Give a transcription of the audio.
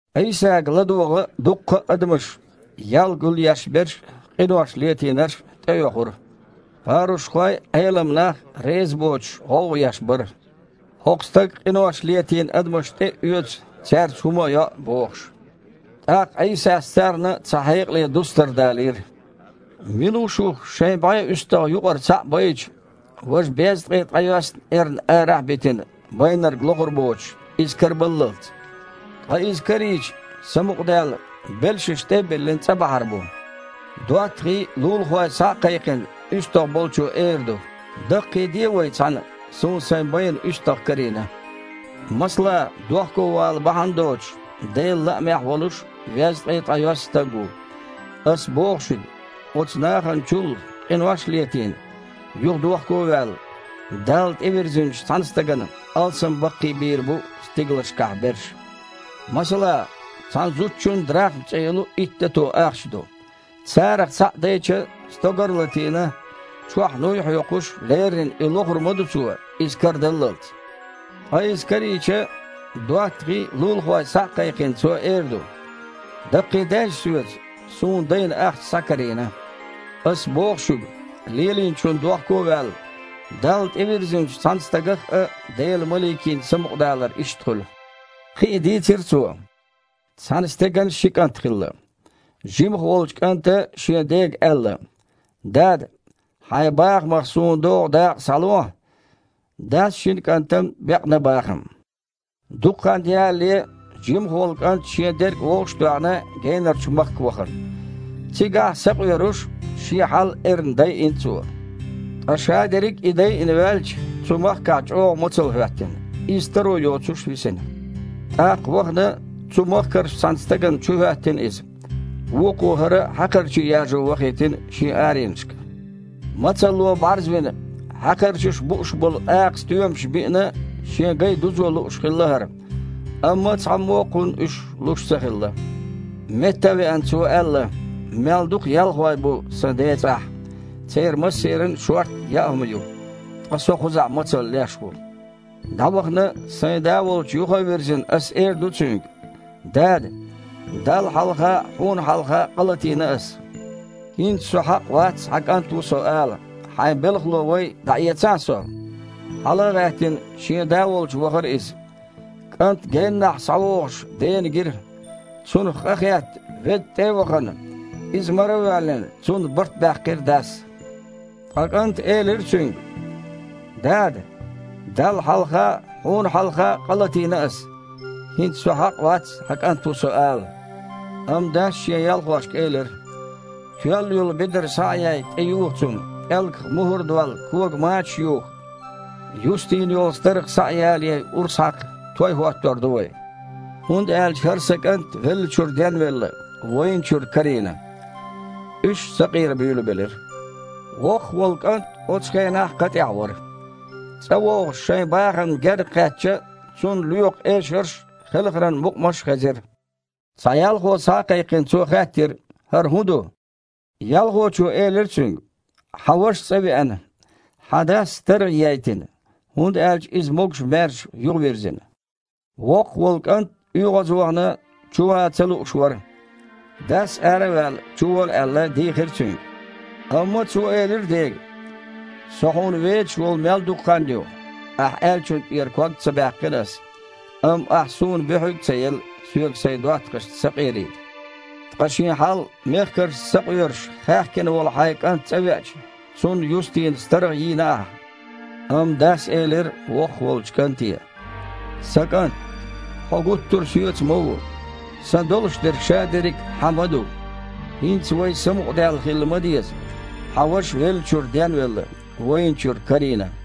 Іийсага ладогІа дуккха а адамаш: ял гулъешберш а, къинош летийнарш а тІеоьхура. Парушхой а, Іелам нах а резабоцуш, гІовгІа еш бара: «ХІокху стага къинош летийна адамаш тІе а оьцу, цаьрца хІума а йоу», – бохуш. ТІаккха Іийсас царна цхьа хьекъале дустар далийра. «Мила ву шух, шайн бІе уьстагІ юкъара цхьаъ байча, важа безткъе ткъайоьсна эрна арахь а битина, байнарг лохур боцуш, иза карабаллалц? Ткъа иза карийча, самукъадаьлла, белшаш тІе а биллина, цІа бахьар бу. ДоттагІий а, лулахой а схьа а кхайкхина, уьстагІ болчо эр ду: „Даккхийде вай цхьаьна, суна сайн байна уьстагІ карийна!“ Масала, дохковала бахьана доцуш, Делан лаамехь а волуш везткъе ткъайоьсна стаг ву. Ас боху шуьга, оцу нахана чул, къинош а летийна, юха дохковаьлла, Далла тІевирзинчу цхьана стагана алсам баккхийбийр бу стигалшкахь берш». «Масала, цхьана зудчун драхма цІе йолу итт дато ахча ду. Царах цхьаъ дайча, стогар а латийна, чохь нуй а хьоькхуш, леррина и лохур ма ду цо, иза карадаллалц. Ткъа иза карийча, доттагІий а, лулахой а схьа а кхайкхина, цо эр ду: „Даккхийдейша соьца: суна дайна ахча схьакарийна!“ Ас боху шуьга, лелийначунна дохко а ваьлла, Далла тІевирзинчу цхьана стагах а Делан маликийн самукъадалар иштта хуьлу». Кхин а дийцира Цо: «Цхьана стеган ши кІант хилла. Жимах волчу кІанта шен дега аьлла: „Дада! Хьайн бахамах суна догІу дакъа схьалохьа“. Дас шина кІантана бекъна бахам. Дукха хан ялале, жимах волу кІант, шен дерг вовшах а тоьхна, генарчу махка вахана. Цигахь, сакъоьруш, шен хьал эрна дайина цо. Ткъа шадерриг и дайина ваьлча, цу махкахь чІогІа мацалла хІоьттина. Иза таро йоцуш висна. ТІаккха вахана цу махкарчу цхьана стагана чухІоьттина иза. Вукхо хІара хьакхарчий яжо вахийтина шен аренашка. Мацалло бІарзвина, хьакхарчаша бууш болу акха стоьмаш биина а, шен гай юзо лууш хилла хІара, амма цхьаммо а кхунна уьш луш ца хилла. Метта а веана, цо элира: „Мел дукха ялхой бу сан ден цІахь, церан массеран а шортта яа хІума ю, ткъа со кхузахь мацалла леш ву! ДІавахана, сайн да волчу юха а вирзина, ас эр ду цуьнга: Дада! Далла хьалха а, хьуна хьалха а къа латийна ас! ХІинца со хьакъ вац хьан кІант ву со ала, хьайн белхало вай, дІаэцахьа со“. Хьала а гІаьттина, шен да волчу вахара иза. КІант геннахь схьавогІуш дена гира. Цунах къахетта, ведда тІе а вахана, иза маравоьллина, цунна барт баьккхира дас. Ткъа кІанта элира цуьнга: „Дада! Далла хьалха а, хьуна хьалха а къа латийна ас. ХІинца со хьакъ вац хьан кІант ву со ала“. Амма дас шен ялхошка элира: „Тоьлла йолу бедар схьа а яй, тІейоха цунна, пІелгах мухІар а долла, кога мачаш а юха. Юстийна йолу старгІа схьа а ялаяй, урс хьакха: той хІоттор ду вай. ХІунда аьлча хІара сан кІант веллачуьра денвелла, вайначуьра карийна“. Уьш сакъера буьйлабелира. Воккхах волу кІант оцу хенахь кха тІехь вара. ЦІа вогІуш, шайн бахамна гергакхаьчча, цунна лоькху эшарш а, хелхаран мукъамаш а хезира. Цхьа ялхо схьа а кхайкхина, цо хаьттира: „ХІара хІун ду?“ Ялхочо элира цуьнга: „Хьан ваша цІа веана. Хьан дас старгІа ейтина, хІунда аьлча иза могуш-маьрша юхавирзина дела“. Воккхах волу кІант, оьгІазвахана, чу ван ца лууш вара. Дас, ара а ваьлла, чувола аьлла, дийхира цуьнга. Амма цо элира дега: „Со хьуна вецаш волу мел дукха хан ю, ахь аьллачунна тІера ког а ца баьккхина ас, амма ахь суна буьхьиг а ца елла, соьга сайн доттагІашца сакъерийта. Ткъа шен хьал мехкаршца сакъоьруш хаьхкина волу хьайн кІант цІа веача, цунна юстийна старгІа йийна ахь“. Амма дас элира воккхах волчу кІанте: „Сан кІант! Хьо гуттар а соьца ма ву, сан долуш дерг шадерриг а хьан ма ду. ХІинца вай самукъадаьлла хила ма деза, хьан ваша веллачуьра денвелла, вайначуьра карийна“».